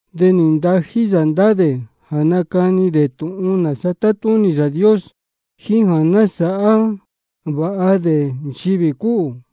De nī ntají yā ndá dē jā nacani dē tūhun nāsa tátúnī Yāā Dios, jíín jā nasāhá vāha dē nchivī cúhū.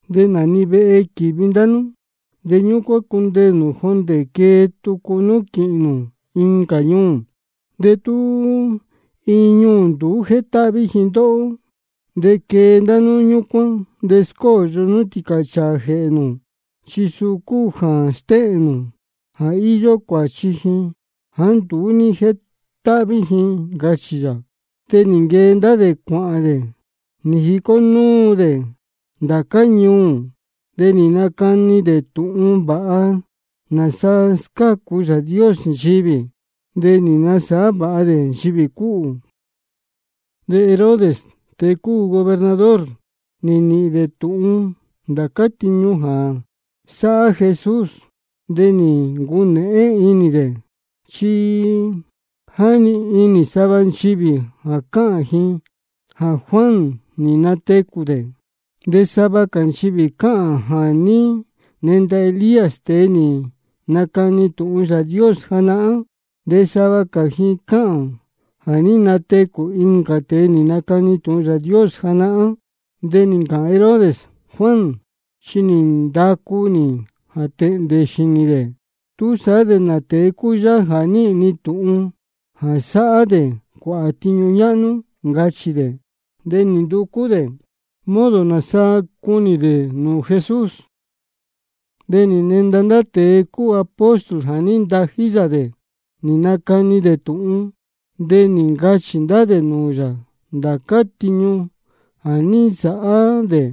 De nā-ni vehe quīvi ndá nú, de ñúcuán cundeē nū jondē quee tucu nú quīhīn nū incā ñuū. De tú iin ñuū nduú jétáhví ji ndóhó, de quee ndá nú ñúcuán, de scóyo nú tīcāchāā jēhē nū, chi suu cúu jā stéhēn nū jā íyó cuāchi ji jāá nduú ní jétáhví ji, ncachī yā. De nī nquee ndá dē cuāhān dē, nī jicó núu dē ndācá ñuū. De nī nacani dē tūhun vāha nāsa scácu Yāā Dios nchivī, de nī nasāhá vāha dē nchivī cúhū. De Herodes, tēe cúu gobernador, nī nīhīn dē tūhun ndācá tiñu jā sáhá Jesús. De nī ncunēhén inī dē, chi jáni inī sava nchivī cáhān ji jā Juan nī natecū dē. De sava cā nchivī cáhān jā ní nenda Elías, tēe nī nacani tūhun Yāā Dios janahán. De sava cā ji cáhān jā ní natecū incā tēe nī nacani tūhun Yāā Dios janahán. De nī ncāhān Herodes: Juan chi nī ndacu nī jā tēhndē xīnī dē. ¿Túsaá de nā tēe cúu yáhá jā níhīn ni tūhun jā sáhá dē cuāhā tiñu ñáhnú? ncachī dē. De nī nducú dē modo nāsa cunī dē nūū Jesús. De nī nenda ndá tēe cúu apóstol jā ní ntají yā dē nī nacani dē tūhun. De nī ncachī ndá dē nūū yā ndācá tiñu jā ní nsāhá dē.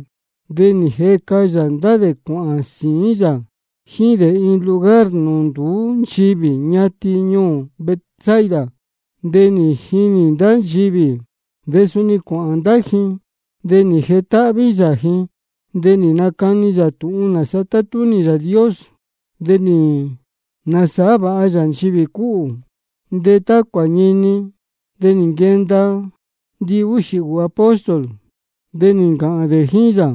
De nī jeca yā ndá dē cuāhān sīín yā jíín dē iin lugar nūū nduú nchivī, ñatin ñuū Betsaida. De nī jinī ndá nchivī, de suni cuāhān ndá ji. De nī jetáhví yā ji, de nī nacani yā tūhun nāsa tátúnī Yāā Dios, de nī nasāhá vāha yā nchivī cúhū. De tá cuāñini, de nī nquenda ndihúxī ūū apóstol, de nī ncāhān dē jíín yā: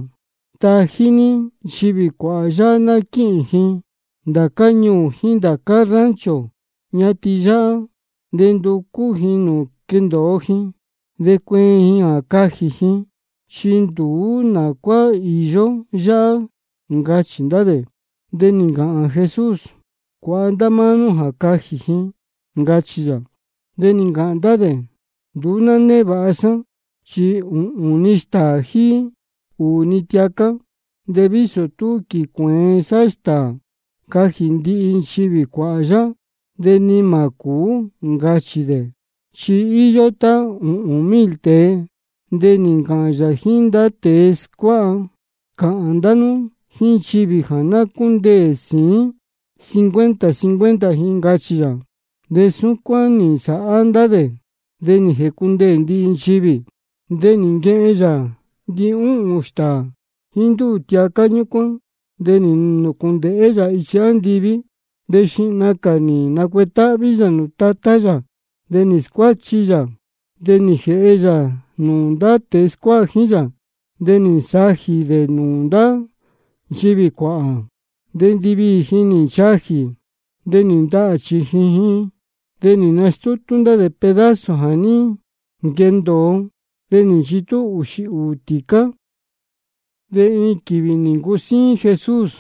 Tají ní nchivī cuāhā yáhá ná quíhīn ji ndācá ñuū jíín ndācá rancho ñatin yáhá, de nducú ji nūū quendōo ji de cueen ji jā cajī ji, chi nduú nā cuá īyó yáhá, ncachī ndá dē. De nī ncāhān Jesús: Cuāha ndá máá nú jā cajī ji, ncachī yā. De nī ncāhān ndá dē: Nduú ná névāha sá, chi ūhūn-ni stāā jíín ūū-ni tiacá. De vísō tú quīcuēen sá stāā cajī ndihi nchivī cuāhā yáhá, de ni mā cūú, ncachī dē. Chi íyó tá ūhūn mil tēe. De nī ncāhān yā jíín ndá tēe scuáha: Cāhān ndá nú jíín nchivī jā ná cúndeē sīín cincuenta cincuenta ji, ncachī yā. De súcuán nī nsāhá ndá dē, de nī jēcundeē ndihi nchivī. De nī nquehen yā ndihúhūn stāā jíín ndúū tiacá ñúcuán, de nī nūcūndēhé yā ichi andiví, de xihna cā nī nacuetáhví yā nūū Tatá yā. De nī scuáchi yā, de nī jēhe yā nūū ndá tēe scuáha jíín yā, de nī nsajī dē nūū ndá nchivī cuāhā. De ndiviī ji nī nchajī, de nī ndahā chījin ji. De nī nastútú ndá dē pedazo jā ní nquendōo, de nī nchitú ūxī ūū tīcá. De iin quīvī nī ncusíín Jesús,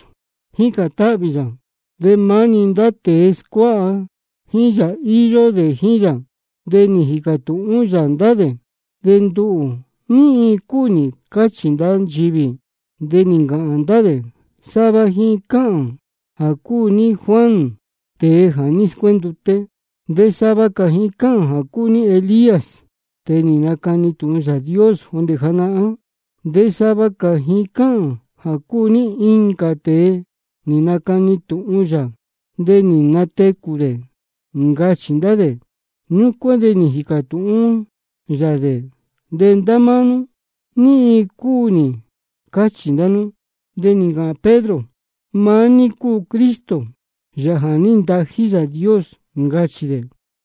jícān táhvī yā, de maá-ni ndá tēe scuáha jíín yā íyó dē jíín yā. De nī jīcā tūhún yā ndá dē: De nduhū, ¿ní iin cúu nī cáchī ndá nchivī? De nī ncāhān ndá dē: Sava ji cáhān jā cúu ní Juan, tēe jā ní scuénduté. De sava cā ji cáhān jā cúu ní Elías, tēe nī nacani tūhun Yāā Dios jondē janahán. De sava cā ji cáhān jā cúu ní incā tēe nī nacani tūhun yā, de nī natecū dē, ncachī ndá dē. Ñúcuán de nī jīcā tūhún yā dē: De ndá máá nú, ¿ní iin cúu nī cáchī ndá nú? De nī ncāhān Pedro: Maá ní cúu Cristo, Yāā jā ní ntají Yāā Dios, ncachī dē.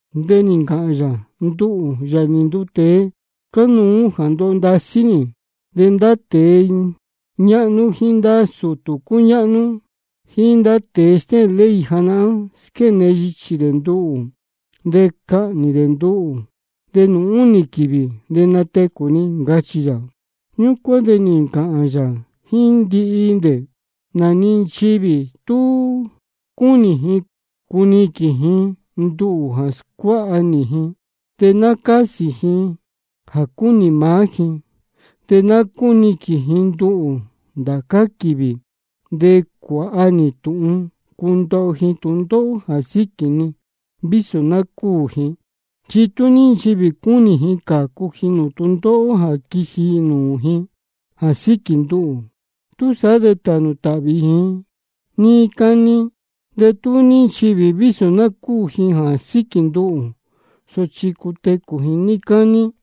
De nī ncāhān yā: Nduhū, Yāā nī nduu tēe, cánuú jā ndoho ndasí nī. De ndá tēe ñáhnú jíín ndá sūtū cúñáhnú jíín ndá tēe stéhēn ley janahán, squéne yichī dē nduhū. De cahnī dē nduhū, de nūū únī quīvī de natecū ni, ncachī yā. Ñúcuán de nī ncāhān yā jíín ndihi dē: Nā-ni nchivī tú cúnī ji cuniquīn ji nduhū jā scuáha nī ji, de ná cásī ji jā cúnī maá ji, de ná cúniquīn ji nduhū ndācá quīvī, de cuāha ji tūhun cundoho ji tūndóhó jā síquī ni, vísō ná cúū ji. Chi tú ní nchivī cúnī ji cācu ji nūū tūndóhó jā quiji nūū ji jā síquī nduhū, túsaá de tānū tāhvī ji níí cání. De tú ní nchivī vísō ná cúū ji jā síquī nduhū, sochi cutecū ji níí cání.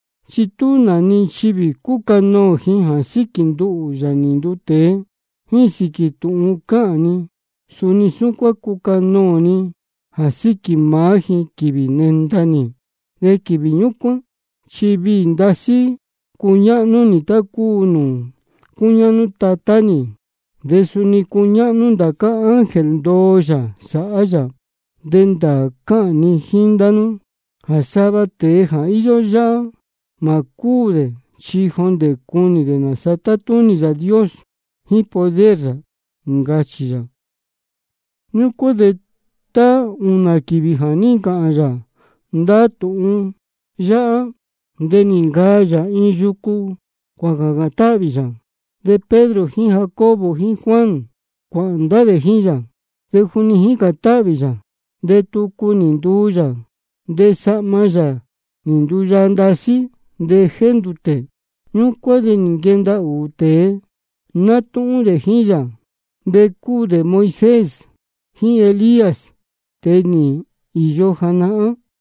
Chi tú nā-ni nchivī cúcanoō ji jā síquī nduhū, Yāā nī nduu tēe, jíín sīquī tūhun cáhān ni, suni súcuán cucanoō ni jā síquī maá ji, quīvī nenda nī. De quīvī ñúcuán chi viī ndasí cuñáhnú nī, tá cúu nūū cúñáhnú Tatá nī, de suni cúñáhnú ndācá ángel ndoo yā sáhá yā. De ndāā cáhān ni jíín ndá nú jā sava tēe íyó yáhá, mā cúū dē chi jondē cunī dē nāsa tátúnī Yāā Dios jíín poder yā, ncachī yā. Ñúcuán de tá ūnā quīvī jā ní ncāhān yā ndá tūhun yáhá, de nī ncaa yā iin yucu, cuācācān táhvī yā. De Pedro jíín Jacobo jíín Juan cuāhān ndá dē jíín yā. De juni jícān táhvī yā, de tucu nī nduu yā, de sahma yā nī nduyaa ndasí, de jéndūtē. Ñúcuán de nī nquenda ūū tēe, nátúhún dē jíín yā, de cúu dē Moisés jíín Elías, tēe jā ní īyo janahán.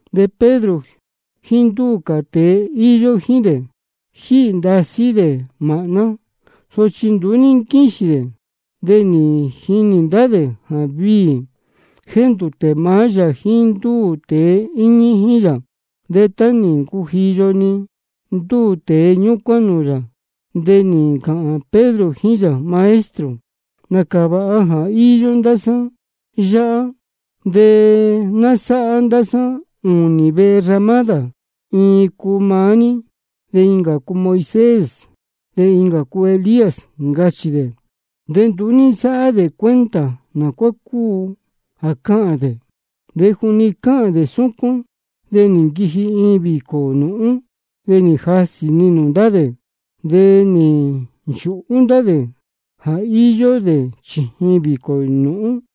De Pedro jíín ndúū cā tēe íyó jíín dē, jíhī ndasí dē māhná, sochi nduú ní nquíxīn dē. De nī jinī ndá dē jā viī jéndūtē maá yā jíín ndúū tēe íñí jíín yā. De tá nī ncujiyo-ni ndúū tēe ñúcuán nūū yā, de nī ncāhān Pedro jíín yā: Maestro, nācā vāha jā íyó ndá sá yáhá. De ná sáhá ndá sá ūnī vehe ramádā, iin cuu maá ní, de incā cuu Moisés, de incā cuu Elías, ncachī dē. De nduú sáhá dē cuenta nā cuá cúu jā cáhān dē. De juni cáhān dē súcuán, de nī nquiji iin vīcō nūhún, de nī jasī-ni nūū ndá dē. De nī nchūhú ndá dē jā íyó dē chījin vīcō nūhún.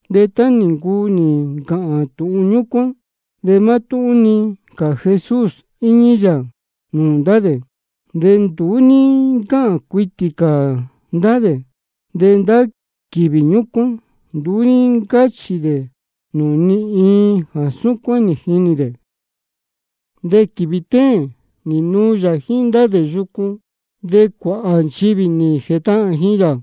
De tá nī ncuu nī ncāhān tūhun ñúcuán, de mátúhún-ni cā Jesús íñí yā nūū ndá dē. De nduú ní ncáhān cuitī cā ndá dē, de ndá quīvī ñúcuán nduú ní ncáchī dē nūū ni iin jā súcuán nī jinī dē. De quīvī téēn nī nuu yā jíín ndá dē yucu. De cuāhā nchivī nī jētahān ji yā.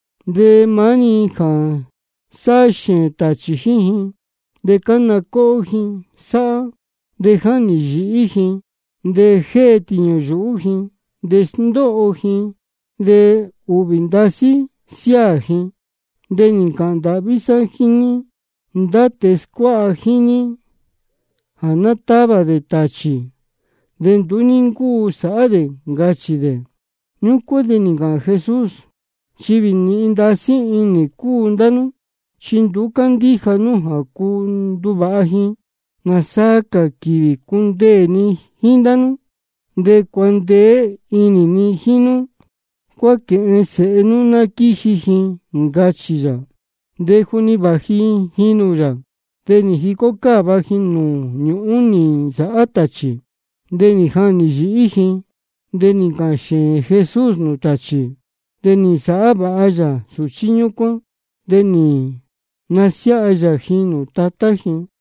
De maá-ni jā sáhá xēēn tāchī jíín ji, de cána cóhó ji sáhá, de jáhnī yīhí ji, de jée tīñū yuhú ji. De sndóho ji, de ūhvī ndasí siáā ji. De nī ncāhān ndāhví sá jíín ndá tēe scuáha jíín ní jā ná távā dē tāchī, de nduú ní ncúu sāhá dē, ncachī dē. Ñúcuán de nī ncāhān Jesús: Nchivī nīhin ndasí inī cúu ndá nú, chi nduú cándíja nú jā cuu nduvāha ji. ¿Nāsaa cā quīvī cundeē ni jíín ndá nú jā cuandeé inī ni jíín nú? Cuáquēhen sēhe nú ná quíji ji, ncachī yā. De juni vāji ji nūū yā, de nī jicó cáva ji nūū ñūhún nī nsāhá tāchī, de nī jahnī yīhí ji. De nī ncāhān xēēn Jesús nūū tāchī, de nī nasāhá vāha yā sūchí ñúcuán, de nī nasiáha yā ji nūū tatá ji.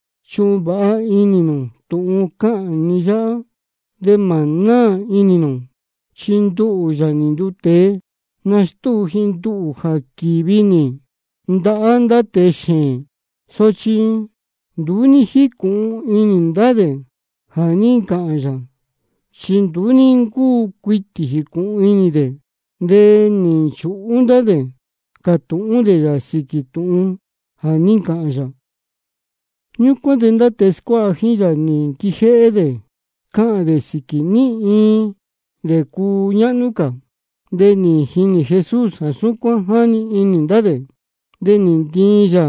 Chuhun vāha inī nū tūhun cáhān ni yáhá, de mā náā inī nū, chi nduhū, Yāā nī nduu tēe, nastúu ji nduhū jā quīvi nī ndahá ndá tēe xēēn. Sochi nduú ní jícūhun inī ndá dē jā ní ncāhān yā, chi nduú ní ncúu cuitī jīcūhun inī dē. De nī nchūhú ndá dē cātūhún dē yā sīquī tūhun jā ní ncachī yā. Ñúcuán de ndá tēe scuáha jíín yā nī nquijéhé dē cáhān dē sīquī ní iin dē cúñáhnú cā. De nī jinī Jesús jā súcuán jáni inī ndá dē. De nī ntiin yā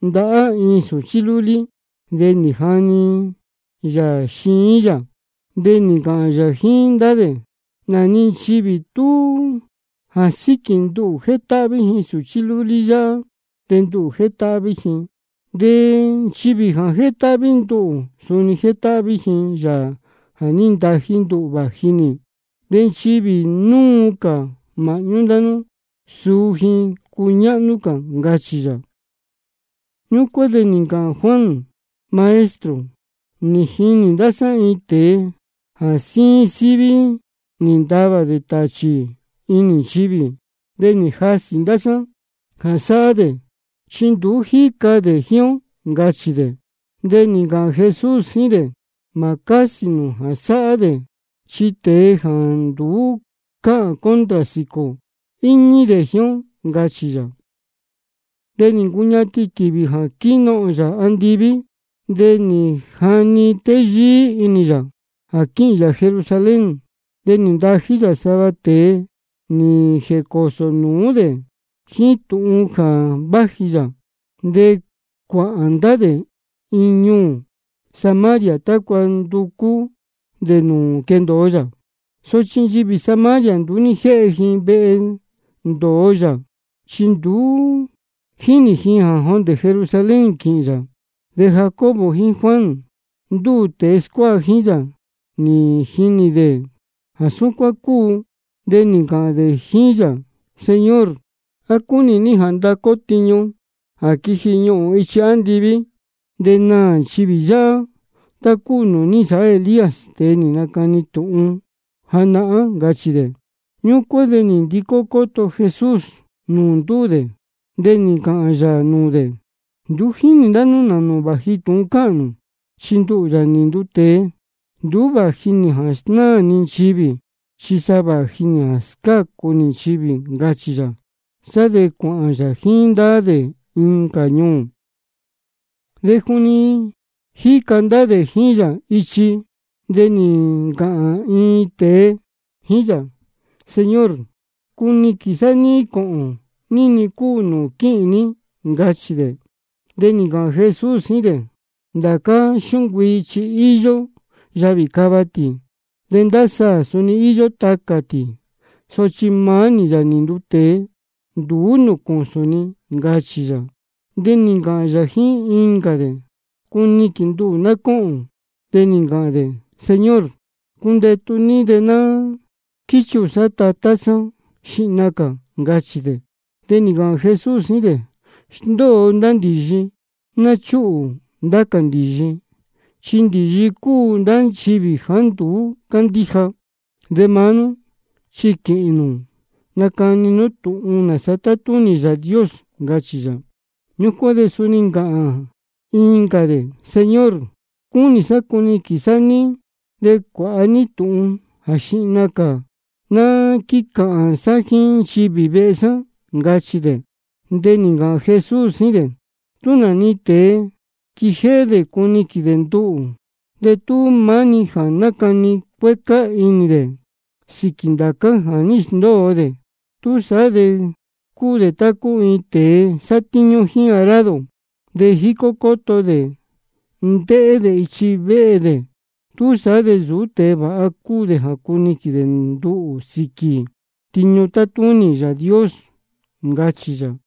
ndahá iin sūchí lúlí, de nī jani yā ji xiín yā. De nī ncāhān yā jíín ndá dē: Nā-ni nchivī tú jā síquī nduhū jétáhví ji sūchí lúlí yáhá, de nduhū jétáhví ji. De nchivī jā jétáhví nduhū, suni jétáhví ji Yāā jā ní ntají nduhū vāji nī. De nchivī núu cā māhñú ndá nú, suu ji cúñáhnú cā, ncachī yā. Ñúcuán de nī ncāhān Juan: Maestro, nī jinī ndá sá iin tēe jā jíín síví ní távā dē tāchī inī nchivī. De nī jasī ndá sá jā sáhá dē, chi nduú jíca dē jíín ó, ncachī dē. De nī ncāhān Jesús jíín dē: Mā cásī nū jā sáhá dē, chi tēe jāá nduú cáhān contra sīquī ō, íñí dē jíín ó, ncachī yā. De nī ncuñatin quīvī jā quínohōn yā andiví, de nī jani téyíí inī yā jā quíhīn yā Jerusalén. De nī ntají yā sava tēe nī jēcōsō nūú dē jíín tūhun jā váji yā. De cuāhān ndá dē iin ñuū Samaria tácua nducú dē nūū quendōo yā. Sochi nchivī Samaria nduú ní jéhe ji vehe ndōo yā, chi nī jinī ji jā jondē Jerusalén quīhīn yā. De Jacobo jíín Juan, ndúū tēe scuáha jíín yā, nī jinī dē jā súcuán cúu, de nī ncāhān dē jíín yā: Señor, ¿á cúnī ní jā ndacu ó tiñu jā quiji ñuhūn ichi andiví, de naā nchivī yáhá, tá cúu nūū ní nsāhá Elías, tēe nī nacani tūhun janahán? ncachī dē. Ñúcuán de nī ndicó cóto Jesús nūū ndúū dē, de nī ncāhān yā nūū dē: Nduú jínī ndá nú nā nūū vāji tūhun cáhān nū. Chi nduhū, Yāā nī nduu tēe, nduú vāji nī jā snáā ni nchivī, chi sa vāji nī jā scácu nī nchivī, ncachī yā. Sá de cuāhān yā jíín ndá dē incā ñuū. De juni jíca ndá dē jíín yā ichi, de nī ncāhān iin tēe jíín yā: Señor, cuniquīn sá ní cōhōn ní-ni cúu nūū quíhīn ní, ncachī dē. De nī ncāhān Jesús jíín dē: Ndācá xúncuii chi íyó yavī cava tī, de ndá saā suni íyó tacā tī. Sochi maá nī, Yāā nī nduu tēe, nduú nūū cūsūn ni, ncachī yā. De nī ncāhān yā jíín incā dē: Cuniquīn nduhū ná cóhōn. De nī ncāhān dē: Señor, cundetu ní de ná quíchuhū sá tatá sá xihna cā, ncachī dē. De nī ncāhān Jesús jíín dē: Sndóo ndá ndīyi, ná chúhū ndá cā ndīyi, chi ndīyi cúu ndá nchivī jāá nduú cándíja. De maá nú, chi quīhīn nū nacani nú tūhun nāsa tátúnī Yāā Dios, ncachī yā. Ñúcuán de suni nī ncāhān incā dē: Señor, cúnī sá cuniquīn sá ní, de cuāha ní tūhun jā xihna ná quícāhān sá jíín nchivī vehe sá, ncachī dē. De nī ncāhān Jesús jíín dē: Tú nā-ni tēe quijéhé dē cuniquīn dē nduhū, de tú maá-ni jā nácani cuécá inī dē sīquī ndācá jā ní sndóo dē, túsaá de cúu dē tá cúu iin tēe sátíñú jíín arado, de jícó cóto dē ndéhé dē ichi véhe dē. Túsaá de nsūú tēe vāha cúu dē jā cuniquīn dē nduhū sīquī tiñu tátúnī Yāā Dios, ncachī yā.